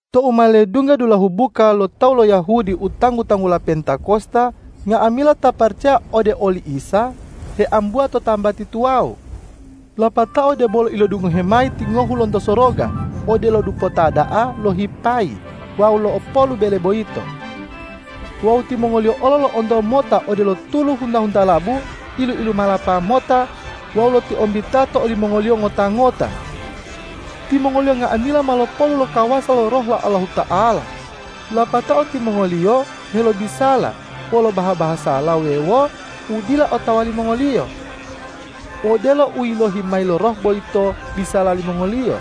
Tou ma ledungga dulahu buka lo tawu lo Yahudi u tanggu-tanggula Pentakosta, nga'amila ta paracaya ode oli Isa heambuwa to tambati tuwawu. Lapatao debolo ilodungohe mayi tingohu lonto soroga odelo dupota da'a lohipayi wawu lo'opolu bele boyito. Wawu timongoliyo olo lo'onto mota u odelo tulu hunta-huntalabu ilu-ilumalapa mota wawu lotiombita to olimongoliyo ngota-ngota. Timongoliyo nga'amila ma lopolu lo kawasa lo Roh lo Allahuta'ala, lapatao timongoliyo helobisala wolo baha-bahasala wuwewo u dila otawa limongoliyo, odelo u yilohi mayi lo Roh boyito bisala limongoliyo.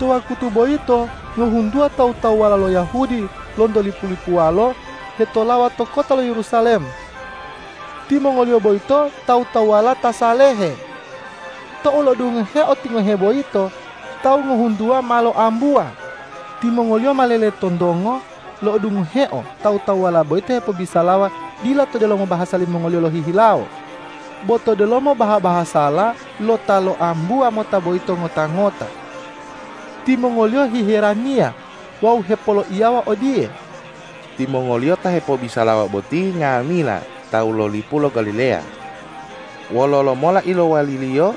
To wakutu boyito ngohuntuwa tawu-tawuwala lo Yahudi lonto lipu-lipuwalo hetolawa to kota lo Yerusalem. Timongoliyo boyito tawu-tawuwala ta salehe. Tou lo'odungoheo tingohe boyito, tawu ngohuntuwa ma loambuwa. Timongoliyo ma leletontongo lo'odungoheo tawu-tawuwala boyito hepobisalawa dila to delomo bahasa limongoliyo lohihilawo, bo to delomo baha-bahasala lo ta loambuwa mota boyito ngota-ngota. Timongoliyo hiheraniya wawu hepoloiyawa odiye,”Timongoliyo ta hepobisalawa boti nga'amila tawu lo lipu lo Galileya. Wololo mola ilowwaliliyo,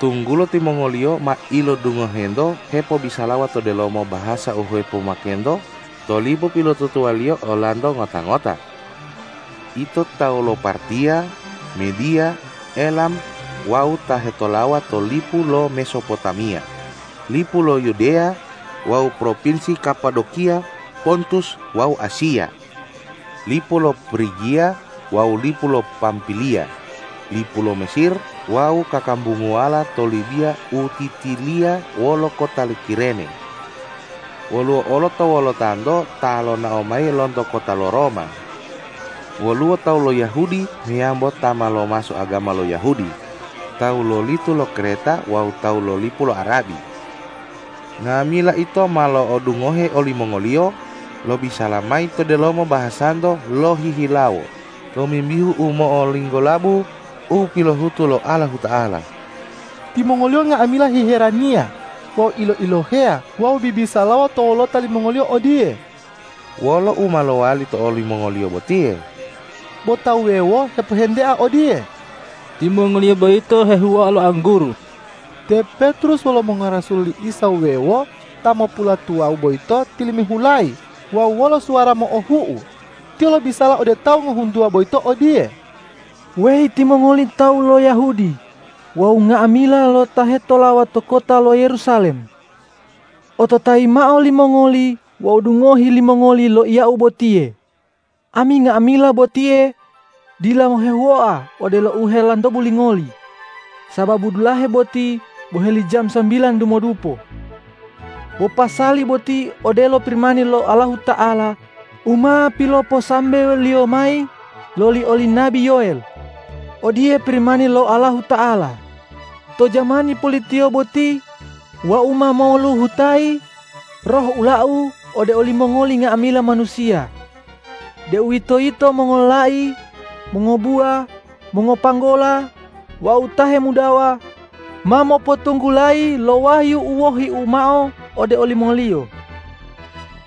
tunggulo timongoliyo ma ilodungohento hepobisalawa to delomo bahasa u hepomakento to lipu pilotutuwaliyo olanto ngota-ngota? Ito tawu lo Partiya, Mediya, Elam wawu ta hetolawa to lipu lo Mesopotamiya, lipu lo Yudeya wawu propinsi Kapadokiya, Pontus wawu Asiya, lipu lo Prigiya wawu lipu lo Pampiliya, lipu lo Mesir wawu kakambunguwala to Libiya u titiliya wolo kota lo Kirene. Woluwo olo to wolotanto ta lonao mayi lonto kota lo Roma. Woluwo tawu lo Yahudi meyambo ta ma lomaso agama lo Yahudi, tawu lo lito lo Kreta wawu tawu lo lipu lo Arabi. Nga'amila ito ma lo'odungohe olimongoliyo lobisala mayi to delomo bahasanto lohihilawo tomimbihu u mo'olinggolabu u pilohutu lo Allahuta'ala!” Timongoliyo nga'amila hiheraniya wawu ilo-iloheya wawu bibisalawa to wolota limongoliyo odiye,”Wolo u ma lowali to olimongoliyo botiye?” Bo ta wuwewo hepohentea odiye,”Timongoliyo boyito hehuwoa lo angguru!” Te Petrus wolo mongorasul li Isa wuwewo ta mopulatuwawu boyito tilimihulayi wawu wolo suwara mo'ohu'u tiyo lobisala ode tawu ngohuntuwa boyito odiye,”Weyi timongoli tawu lo Yahudi wawu nga'amila ta hetolawa to kota lo Yerusalem! Ototayi mao limongoli wawu dungohi limongoli loiyau botiye. Ami nga'amila botiye dila hehuwoa odelo u helantobu limongoli, sababu dulahe boti boheli jamu sambilan dumodupo. Bo pasali boti odelo Pirimani lo Allahuta'ala u ma piloposambewo-Liyo mayi loli oli nabi Yoel, ”Odiye Pirimani lo Allahuta'ala, ’To jamani pulitiyo boti Wau ma moluhutayi Roh ula-U ode olimongoli nga'amila manusiya, deuwitoyito mongololai, mongobuwa, mongopanggola wawu ta hemudawa, ma mopotunggulayi lo wahyu u wohi-U mao ode olimongoliyo.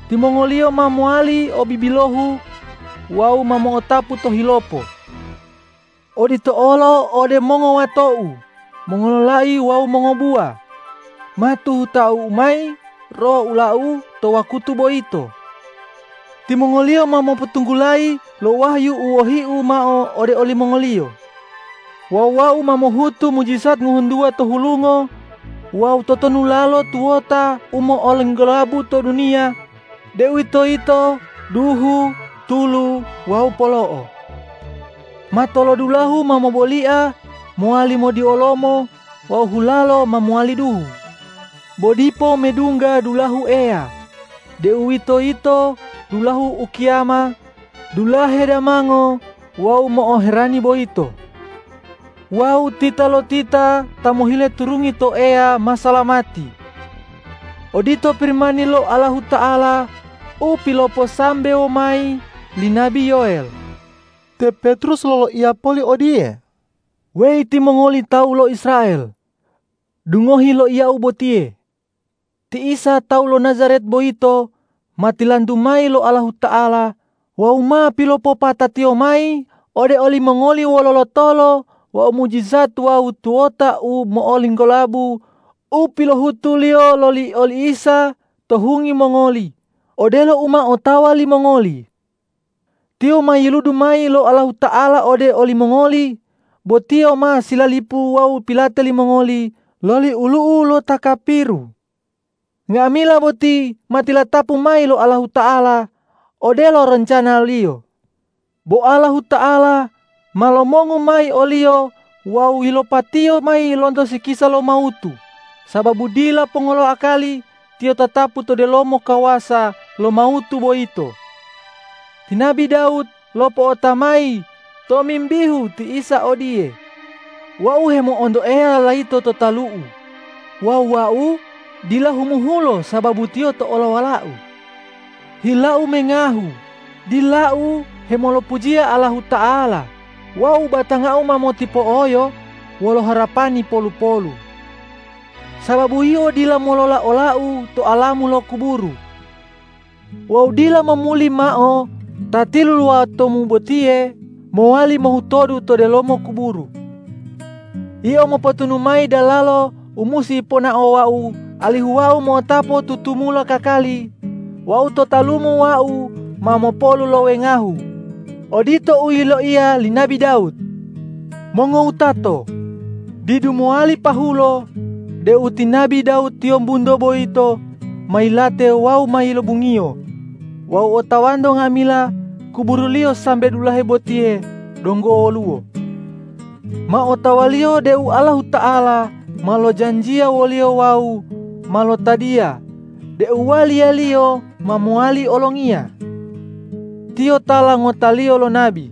Timongoliyo ma mowali o bibilohu wawu ma mo'otapu tohilopo. Odito olo ode mongowato-U mongololai wawu mongobuwa, ma tuhuta-U mayi Roh ula-U to wakutu boyito. Timongoliyo ma mopotunggulayi lo wahyu u wohi-U mao ode olimongoliyo. Wawu Wau ma mohutu mujijat ngohuntuwa to hulungo wawu totonulalo tuwota u mo'olinggolabu to duniya, deuwitoyito duhu, tulu wawu polo'o. Matolodulahu ma mobolia mowali modiolomo wawu hulalo ma mowali duhu, bo dipo medungga dulahu Eya, deuwitoyito dulahu ukiyama, dulahe damango wawu mo'oherani boyito. Wawu titalotita ta mohile turungi to Eya ma salamati.’ Odito Pirimani lo Allahuta'ala u piloposambewo mayi li nabi Yoel.” Te Petrus loloiya poli odiye,”Weyi timongoli tawu lo Israel! Dungohi loiyau botiye: Ti Isa tawu lo Najaret boyito ma tilantu mayi lo Allahuta'ala wawu ma pilopopata-Tiyo mayi ode olimongoli wolo lotolo wawu mujijat wawu tuwota u mo'olinggolabu u pilohutu-Liyo loli oli Isa to hungi mongoli, odelo u ma otawa limongoli. Tiyo ma yiludu mayi lo Allahuta'ala ode olimongoli, bo Tiyo ma silalipu wawu pilate limongoli loli olu'u lo ta kapiru. Nga'amila boti ma tilatapu mayi lo Allahuta'ala odelo roncana-Liyo. Bo Allahuta'ala ma lomongu mayi o-Liyo wawu yilopa-Tiyo mayi lonto sikisa lo mawutu, sababu dila ponga lo akali Tiyo tatapu to delomo kawasa lo mawutu boyito. Ti nabi Dawud lopo'ota mayi tomimbihu ti Isa odiye, ’Wau hemo'onto Eya layito to talu'u wawu wau dila humuhulo sababu Tiyo to olowalau. Hilau mengahu, dilau hemolopujiya Allahuta'ala wawu batangau ma motipo'oyo wolo harapani polu-polu. Sababu Yio dila ta molola ola-U to alamu lo kuburu wawu dila momuli mao Ta tilulawotu-Mu botiye mowali mohutodu to delomo kuburu. Yio mopotunu mayi dalalo u musi ponaowau alihu wau mo'otapu tutumula kakali wawu to talumu wau ma mopolu lo wengahu.’ Odito u yiloiya li nabi Dawud. Mongowutato, didu mowali pahulo deu ti nabi Dawud tiyombunto boyito ma yilate wawu ma yilobungiyo wawu otawanto nga'amila kuburuliyo sambe dulahe botiye donggo woluwo. Ma otawaliyo deu Allahuta'ala ma lojanjiya woliyo wawu ma lotadiya deu waliyaliyo ma mowali olongiya. Tiyo tala ngotaliyo lo nabi.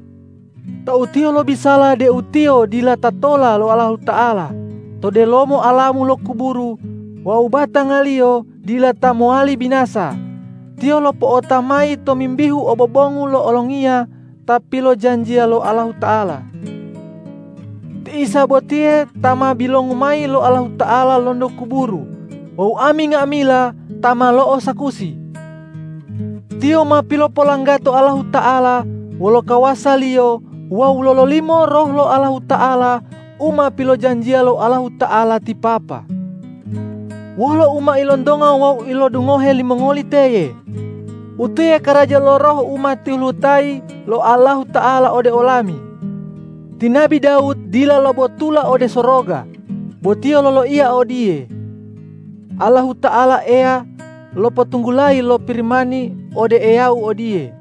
Tou tiyo lobisala deu tiyo dila ta tola lo Allahuta'ala to delomo alamu lo kuburu wawu batangaliyo dila ta mowali binasa, tiyo lopo'ota mayi tomimbihu obobongu lo Olongiya ta pilojanjiya lo Allahuta'ala. Ti Isa botiye ta ma bilongu mayi lo Allahuta'ala lonto kuburu wawu ami nga'amila ta ma lo'osakusi. Tiyo ma pilopolanggato Allahuta'ala wolo kawasa-Liyo wawu lololimo Roh lo Allahuta'ala u ma pilojanjiya lo Allahuta'ala ti Papa. Wolo u ma ilontonga wawu ilodungohe limongoli teye utiye karaja lo Roh u ma tiluhutayi lo Allahuta'ala ode olami. Ti nabi Dawud dila lobotula ode soroga, bo tiyo loloiya odiye, ’Allahuta'ala Eya lopotunggulayi lo Pirimani ode Eyau odiye: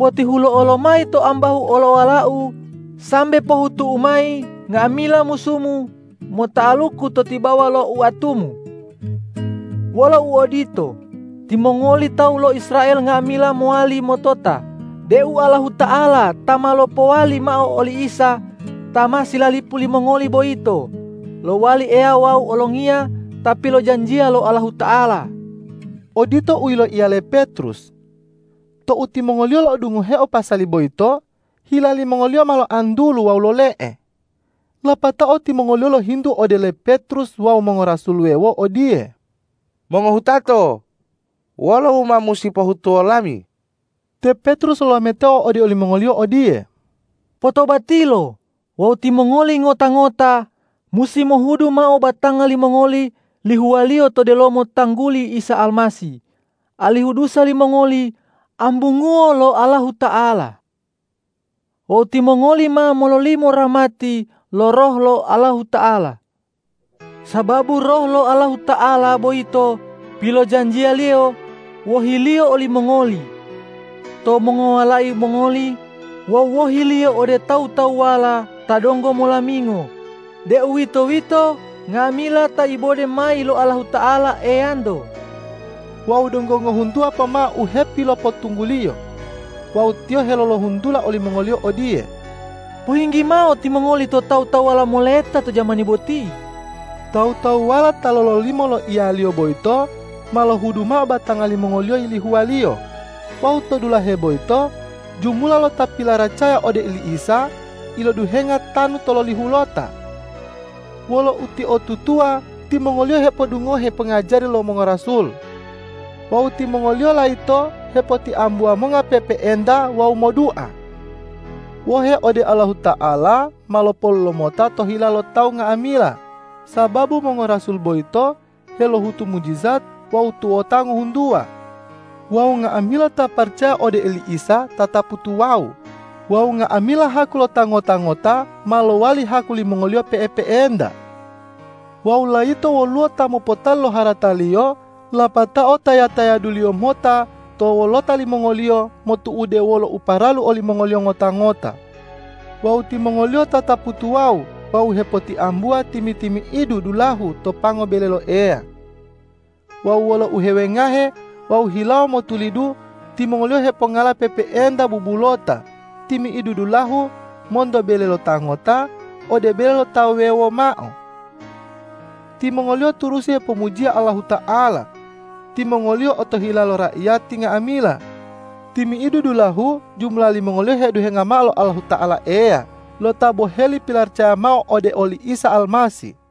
Potihulo'o lomayi to ambahu olowala-U, sambe pohutu-U mayi nga'amila musu-Mu mota'aluku to tibawa lo oatu-Mu!’ Wolo uodito, timongoli tawu lo Israel nga'amila mowali motota deu Allahuta'ala ta ma lopowali mao oli Isa ta ma silalipu limongoli boyito, lowali Eya wawu Olongiya ta pilojanjiya lo Allahuta'ala!” Odito u yiloiya le Petrus. Tou timongoliyo lo'odungoheo pasali boyito, hila limongoliyo ma loantulu wawu lole'e, lapatao timongoliyo lohintu ode le Petrus wawu mongorasul wuwewo odiye,”Mongowutato, wolo u ma musi pohutuwo lami?” Te Petrus lolametao ode olimongoliyo odiye,”Potobatilo wawu timongoli ngota-ngota musi mohudu mao batanga limongoli lihuwaliyo to delomo tangguli Isa Almasih, alihu dusa limongoli ambunguwo lo Allahuta'ala. Wawu timongoli ma mololimo rahmati lo Roh lo Allahuta'ala. Sababu Roh lo Allahuta'ala boyito pilojanjiya-Liyo wohi-Liyo olimongoli, to mongowalai mongoli wawu wohiliyo ode tawu-tawuwala ta donggo molamingo, deuwitoyito nga'amila ta ibode mayi lo Allahuta'ala Eyanto.” Wawu donggo ngohuntuwa pomao u hepilopotungguliyo wawu tiyo helolohuntula olimongoliyo odiye,”Pohinggi mao timongoli to tawu-tawuwala moleta to jamani boti.” Tawu-tawuwala ta lololimo loiyaliyo boyito ma lohudu mao batanga limongoliyo yilihuwaliyo wawu to dulahe boyito jumula lo ta pilaracaya ode oli Isa iloduhenga tanu tololihulota. Wolo utiotutuwa timongoliyo hepodungohe pongajari lo mongorasul. Wawu timongoliyo layito hepotiambuwa monga pe'epe'enta wawu modua. Wohe ode Allahuta'ala ma lopolu lomota to hila lo tawu nga'amila, sababu mongorasul boyito helohutu mujijat wawu tuwota ngohuntuwa. Wawu nga'amila ta paracaya ode oli Isa tatapu tuwawu wawu nga'amila haku lo ta ngota-ngota ma lowali haku limongoliyo pe'epe'enta. Wawu layito woluwo ta mopotali lo harataliyo, lapatao taya-tayaduliyo mota to wolota limongoliyo motu'ude wolo u paralu olimongoliyo ngota-ngota. Wawu timongoliyo tatapu tuwawu wawu hepotiambuwa timi-timi'idu dulahu to pango bele lo Eya. Wawu wolo uhewengahe wawu hilawo motulidu timongoliyo hepongala pe'epe'enta bubulota timi'idu dulahu monto bele lo ta ngota ode bele lo tawu wuwewo mao. Timongoliyo turusi hepomujiya Allahuta'ala. Timongoliyo otohila lo raiyati nga'amila. Timi'idu dulahu jumula limongoliyo heduhenga mao lo Allahuta'ala Eya lo ta boheli pilaracaya mao ode oli Isa Almasih.